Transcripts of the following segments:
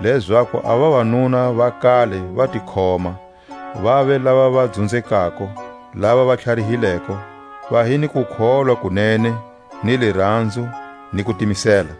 lezaku a vavanuna va kale va ti khoma, vave lava va dzunzekako, lava va tlharihileko, va hi ni kukholwa ku nene, ni liranzo, ni kutimisela.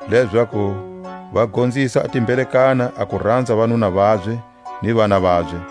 lezaku va gonzisa a timbelekana a ku ranza vanuna vabye ni vana vabye,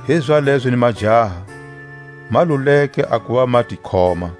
Hizalezo ni majaha, ma luleke a kuva ma ti khoma;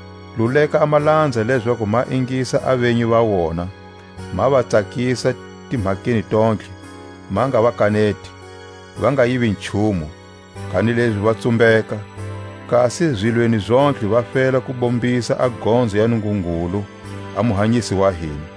Luleka a malanza lezaku ma ingisa a venyi va wona, ma va tsakisa timhakeni tontlhe, ma nga va kaneti; va nga yivi nchumu, kanilezi va tsumbeka; kasi zilweni zontlhe va fela ku bombisa a gonzo ya Nungungulu a Muhanyisi wa hina.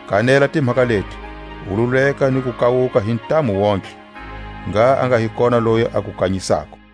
Kanela timhaka leti, u luleka ni ku kawuka hi ntamu wontihe. Ngha a nga hi kona loyi a ku kanyisako.